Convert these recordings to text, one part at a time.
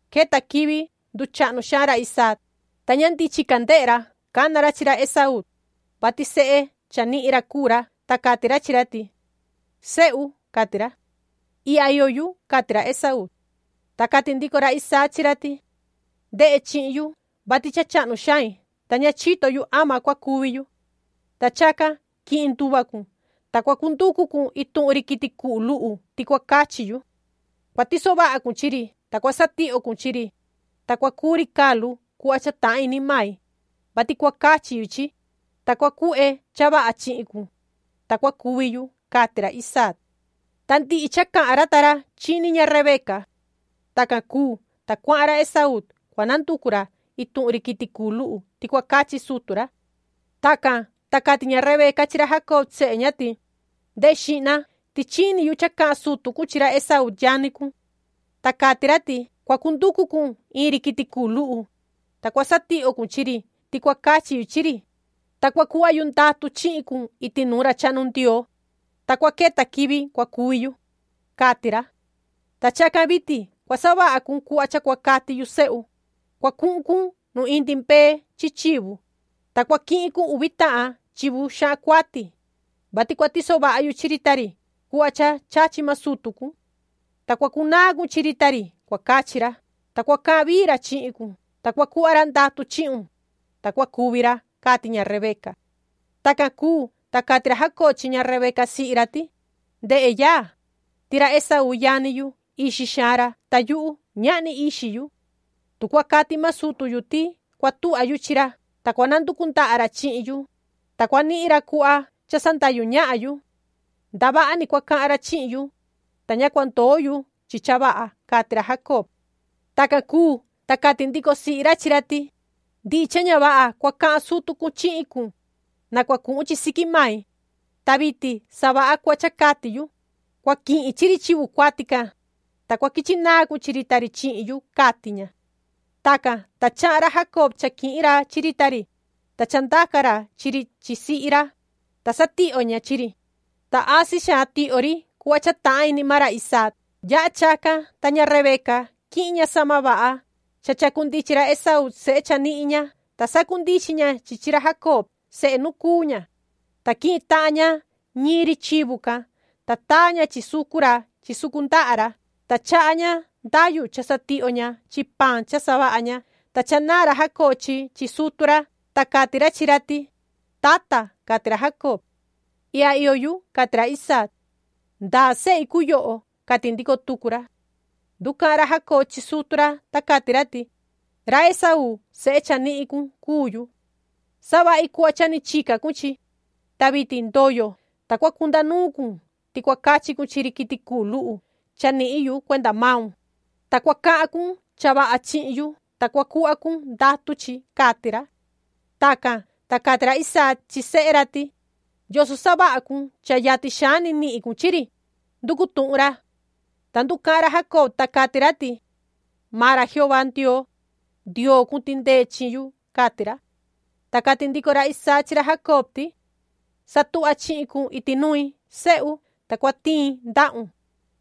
Queta quivi nduchahnu xaan ra Isaac, ta ña ndichin ca ndehe ra. Cana ra chi ra Esaú, vati sehe cha nihin ra cuu ra, ta cati ra chi ra ti: ―Sehu ―cati ra. ―Ihya iyo yu ―cati ra Esaú. Ta cati ndico ra Isaac chi ra ti: ―Ndehe chihin yu, vati cha chahnu xain, ta ña chito yu ama cua cuvi yu. Ta chacan quihin nduva cun, ta cua cunducu cun ituhun ri quiti cuhu luhu ti cua cachi yu. Cua tiso vaha cun chi ri, ta cua satihyo cun chi ri, ta cua cuu ri calu cuhva cha tahan ini mai, vati cua cachi yu chi, ta cua cuhve cha vaha chihin cun, ta cua cuvi yu ―cati ra Isaac. Ta ndihi cha cahan ra ta ra chini ña Rebeca. Tacan cuu, ta cuahan ra Esaú, cua nanducu ra ituhun ri quiti cuhu luhu ti cua cachi sutu ra. Tacan, ta cati ña Rebeca chi ra Jacob sehe ña ti: ―Ndehe xihna, ti chini yu cha cahan sutu cun chi ra Esaú yani cun. Ta cati ra ti: ‘Cua cunducu cun ituhun ri quiti cuhu luhu, ta cua satihyo cun chi ri ti cua cachi yu chi ri, ta cua cuhva yu ndatu chihin cun iti nuun ra chahnu Ndioo, ta cua queta quivi cua cuvi yu’, cati ra. Ta chacan vitin cua savaha cun cuhva cha cua cati yu, sehu. Cua cuhun cun nu indi mbee chi chivu, ta cua quihin cun uvi tahan chivu xahan cuati, vati cua tiso vaha yu chi ri ta ri cuhva cha chachi maan sutu cun. Ta cua cunaan cun chi ri ti cua cachi ra, ta cua cahan vii ra chihin cun, ta cua cuhva ra ndatu chihun, ta cua cuvi ra ―cati ña Rebeca. Tacan cuu, ta cati ra Jacob chi ña Rebeca sihi ra ti: ―Ndehe, yaa, ti ra Esaú yani yu, ixi xaan ra, ta yuhu, ñahni ixi yu. Tu cua cati maan sutu yu ti cua tuhva yu chi ra, ta cua nanducu ndaha ra chihin yu, ta cua nihin ra cuhva cha sandahyu ñahan yu. Ndavaha ni cua cahan ra chi yu, ta ña cua ndoo yu chi cha vaha ―cati ra Jacob. Tacan cuu, ta cati ndico sihi ra chi ra ti: ―Ndihi cha ña vaha cua cahan sutu cun chihin cun, na cua cuhun chi siqui mai, ta vitin savaha cuhva cha cati yu. Cua quihin chi ri chivu cuati can, ta quichi naan cun chi ri ta ri chihin yu ―cati ña. Tacan, ta chahan ra Jacob cha quihin ra chi ri ta ri, ta cha ndaca ra chi ri chi sihi ra, ta satihyo ña chi ri, ta asi xaan tihyo ri cuhva cha tahan ini maan ra Isaac. Yaha chacan, ta ña Rebeca, quihin ña sahma vaha cha chacundichin ra Esaú sehe chanihin ña, ta sacundichin ña chi chi ra Jacob, sehe nu cuu ña. Ta quihin tahan ña ñiin ri chivu can, ta taa ña chi sucu ra chi sucu ndaha ra. Ta chaha ña ndayu cha satihyo ña chi paan cha savaha ña. Ta chanaan ra Jacob chi chi sutu ra, ta cati ra chi ra ti: ―Tata ―cati ra Jacob. ―Ihya iyo yu ―cati ra Isaac―. ¿Ndaa sehi cuu yoho? ―cati ndico tucu ra. Nducahan ra Jacob chi sutu ra, ta cati ra ti: ―Ra Esaú, sehe chanihin cun, cuu yu. Savahi cuhva cha ni chica cun chi, ta vitin ndoyo, ta cua cunda nuun cun ti cua cachi cun chi ri quiti cuhu luhu cha nihin yu cuenda maun, ta cua cahan cun cha vaha chihin yu, ta cua cuhva cun ndatu chi ―cati ra. Tacan, ta cati ra Isaac chi sehe ra ti: ―¿Yoso savaha cun cha yatin xaan ni nihin cun chi ri? ―nducu tuhun ra. Ta nducahan ra Jacob, ta cati ra ti: ―Maan ra Jehová Ndioo, Ndioo cun tindee chi yu ―cati ra. Ta cati ndico ra Isaac chi ra Jacob ti: ―Satuhva chihin cun iti nui, sehu, ta cua tiin ndahun,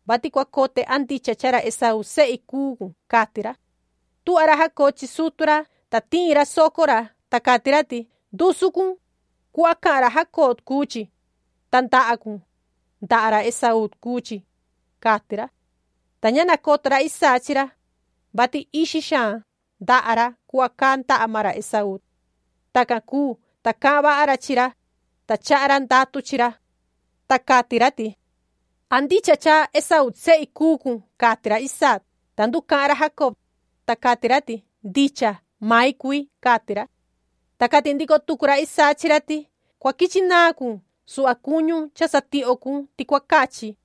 vati cua cote a ndicha cha ra Esaú sehi cuu cun ―cati ra. Tuhva ra Jacob chi sutu ra, ta tiin ra soco ra, ta cati ra ti: “Ndusu cun, cuhva cahan ra Jacob cuu chi, ta ndaha cun, ndaha ra Esaú cuu chi’’, cati ra. Ta ña nacoto ra Isaac chi ra, vati ixi xaan ndaha ra cuhva caa ndaha maan ra Esaú. Tacan cuu, ta cahan vaha ra chi ra, ta chaha ra ndatu chi ra. Ta cati ra ti: ―¿An ndicha cha Esaú sehi cuu cun? ―cati ra Isaac. Ta nducahan ra Jacob, ta cati ra ti: ―Ndicha, mai cui ―cati ra. Ta cati ndico tucu ra Isaac chi ra ti: ―Cua quichi naan cun suhva cuñu cha satihyo cun ti cua cachi,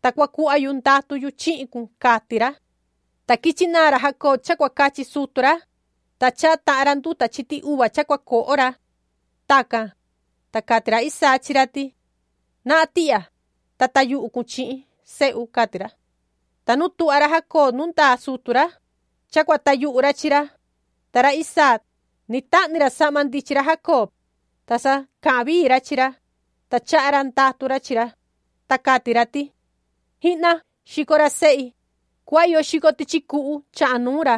ta cua cuhva yu ndatu yu chihin cun ―cati ra. Ta quichi naan ra Jacob cha cua cachi sutu ra, ta chaha tahan ra nduta chiti uva cha cua coho ra. Tacan, ta cati ra Isaac chi ra ti: ―Nahan tihya, ta tayuhu cun chi, sehu ―cati ra. Ta nu tuhva ra Jacob nu ndaa sutu ra, cha cua tayuhu ra chi ra, ta ra Isaac, ni tahni ra sahma ndichin ra Jacob, ta sa cahan vii ra chi ra, ta chaha ra ndatu ra chi ra, ta cati ra ti: “Jihna, xico ra sehi, cuhva iyo xico tichi cuhu chahan nuun ra,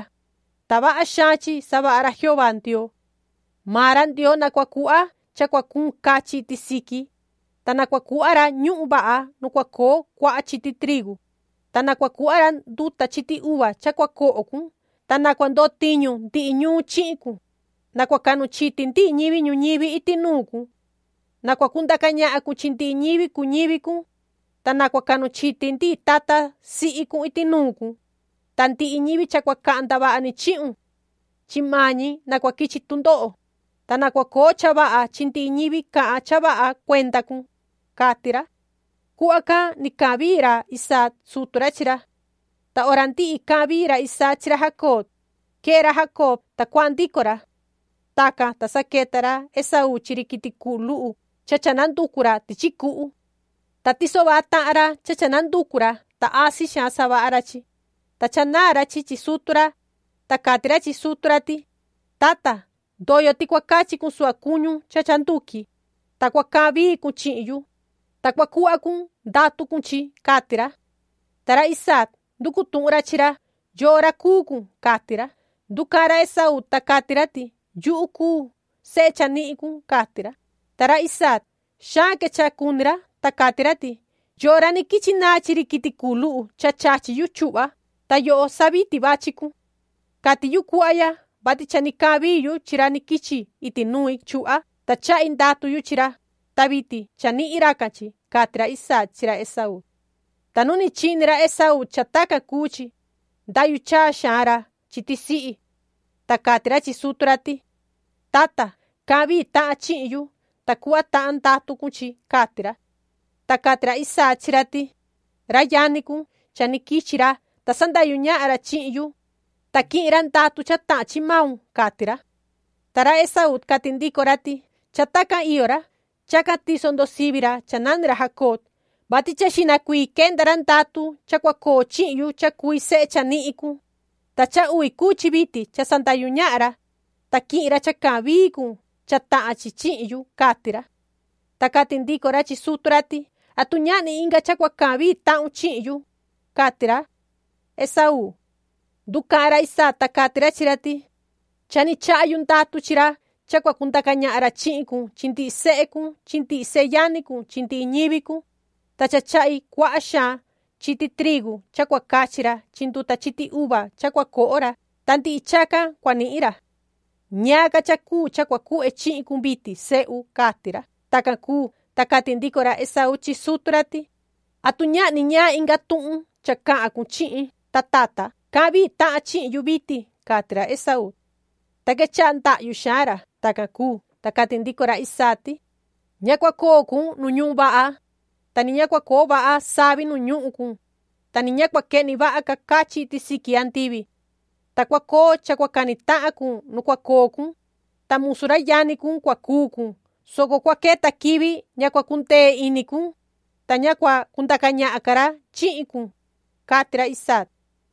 ta vaha xaan chi savaha ra Jehová Ndioo. Maan ra Ndioo na cua cuhva cha cua cuun cachin iti siqui, ta na cua cuhva ra ñuhun vaha nu cua coo cuaha chiti trigu, ta na cua cuhva ra nduta chiti uva cha cua coho cun. Ta na cua ndotiñu ndihi ñuun chihin cun, na cua cahnu chiti ndihi ñivi ñuñivi iti nuun cun. Na cua cundaca ñahan cun chi ndihi ñivi cuu ñivi cun, ta na cua cahnu chiti ndihi tata sihi cun iti nuun cun, ta ndihi ñivi cha cua cahan ndavaha ni chihun, chi maan ñi na cua quichi tundoho, ta na cua coo cha vaha chi ndihi ñivi cahan cha vaha cuenda cun”, cati ra. Cuhva can ni cahan vii ra Isaac sutu ra chi ra. Ta hora ndihi cahan vii ra Isaac chi ra Jacob, quee ra Jacob, ta cuahan ndico ra. Tacan, ta sa queta ra Esaú chi ri quiti cuhu luhu cha cha nanducu ra tichi cuhu. Ta tiso vaha tahan ra cha cha nanducu ra, ta asi xaan savaha ra chi, ta chanaan ra chi chi sutu ra, ta cati ra chi sutu ra ti: ―Tata, ndoyo ti cua cachi cun suhva cuñu cha cha nduqui, ta cua cahan vii cun chihin yu, ta cua cuhva cun ndatu cun chi ―cati ra. Ta ra Isaac, nducu tuhun ra chi ra: ―¿Yoo ra cuu cun? ―cati ra. Nducahan ra Esaú, ta cati ra ti: ―Yuhu cuu sehe chanihin cun ―cati ra. Ta ra Isaac, xaan quechaha cuni ra, ta cati ra ti: ―¿Yoo ra ni quichi naan chi ri quiti cuhu luhu cha chachi yu chuhva? Ta yoho sa vitin vachi cun. Cati yu cuhva ya, vati cha ni cahan vii yu chi ra ni quichi iti nui chuhva, ta chahi ndatu yu chi ra. Ta vitin cha nihin racan chi ―cati ra Isaac chi ra Esaú. Ta nu ni chini ra Esaú cha tacan cuu chi, ndahyu chaa xaan ra chi tisihi, ta cati ra chi sutu ra ti: ―Tata, cahan vii tahan chihin yu, ta cuhva tahun ndatu cun chi ―cati ra. Ta cati ra Isaac chi ra ti: ―Ra yani cun, cha ni quichi ra, ta sandahyu ñahan ra chihin yu, ta quihin ra ndatu cha tahan chi maun ―cati ra. Ta ra Esaú, cati ndico ra ti: ―Cha tacan iyo ra. Chacan tiso ndo sivi ra cha nani ra Jacob, vati cha xihna cuii quenda ra ndatu cha cua coo chihin yu cha cui sehe chanihin cun, ta cha uvi cuu chi vitin cha sandahyu ñahan ra, ta quihin ra cha cahan vii cun cha tahan chi chihin yu ―cati ra. Ta cati ndico ra chi sutu ra ti: ―¿Atu ñahni inga cha cua cahan vii tahun chihin yu? ―cati ra Esaú. Nducahan ra Isaac, ta cati ra chi ra ti: ―Cha ni chaha yu ndatu chi ra cha cua cundaca ñahan ra chihin cun chi ndihi sehe cun chi ndihi seyani cun chi ndihi ñivi cun, ta cha chahi cuaha xaan chiti trigu cha cua cachi ra chi nduta chiti uva cha cua coho ra, ta ndihi chacan cua nihin ra. ¿Ñaan ca cha cuu cha cua cuhve chihin cun vitin, sehu? ―cati ra. Tacan cuu, ta cati ndico tucu ra Esaú chi sutu ra ti: ―¿Atu ñahni ñaan inga tuhun cha cahan cun chihin, ta tata? Cahan vii tahan chihin yu vitin ―cati ra Esaú, ta quechaha ndahyu xaan ra. Tacan cuu, ta cati ndico ra Isaac ti: “Ña cua coo cun nu ñuhun vaha, ta ni ña cua coo vaha savi nu ñuhun cun, ta ni ña cua quehni vaha ca cachin iti siqui andivi. Ta cua coo cha cua cani tahan cun nu cua coo cun, ta musu ra yani cun cua cuu cun, soco cua queta quivi ña cua cundee ini cun, ta ña cua cundaca ñahan ca ra chihin cun”, cati ra Isaac.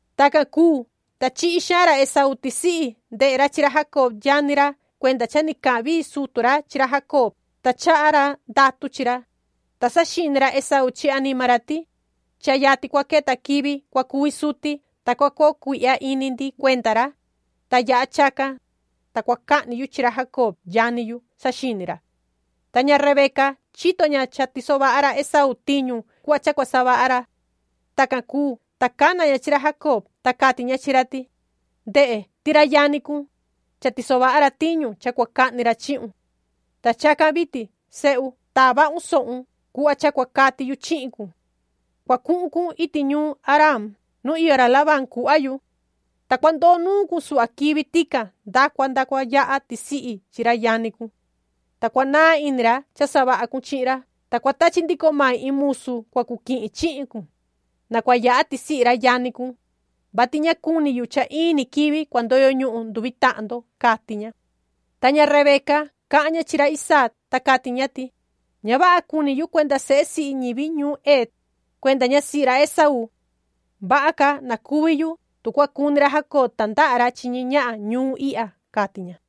Tacan cuu, ta chihi xaan ra Esaú tisihi ndehe ra chi ra Jacob yani ra cuenda cha ni cahan vii sutu ra chi ra Jacob ta chaha ra ndatu ra chi ra, ta saxini ra Esaú chi anima ra ti: “Cha yatin cua queta quivi cua cuvi suti, ta cua coo cuihya ini ndi cuenda ra, ta yaha chacan, ta cua cahni yu chi ra Jacob yani yu”, saxini ra. Ta ña Rebeca, chito ña cha tiso vaha ra Esaú tiñu cuhva cha cua savaha ra. Tacan cuu, ta cana ña chi ra Jacob, ta cati ña chi ra ti: ―Ndehe, ti ra yani cun, cha tiso vaha ra tiñu cha cua cahni ra chihun. Ta chacan vitin, sehu, taa vahun sohun cuhva cha cua cati yu chihin cun. Cua cuhun cun iti ñuun Haraan nu iyo ra Labán cuhva yu. Ta cua ndoo nuun cun suhva quivi tican nda cua yaha tisihi chi ra yani cun. Ta cua naa ini ra cha savaha cun chi ra, ta cua tachi ndico mai iin musu cua cu quihin chihin cun, na cua yaha tisihi chi ra yani cun, vati ña cuni yu cha in ni quivi cua ndoyo ñuhun nduvi tahan ndo ―cati ña. Ta ña Rebeca, cahan ña chi ra Isaac, ta cati ña ti: ―Ña vaha cuni yu cuenda sehe sihi ñivi ñuun Het, cuenda ñasihi ra Esaú. Vaha ca na cuvi yu tu cua cuni ra Jacob tandaha ra chi ñi ñahan ñuun ihya ―cati ña.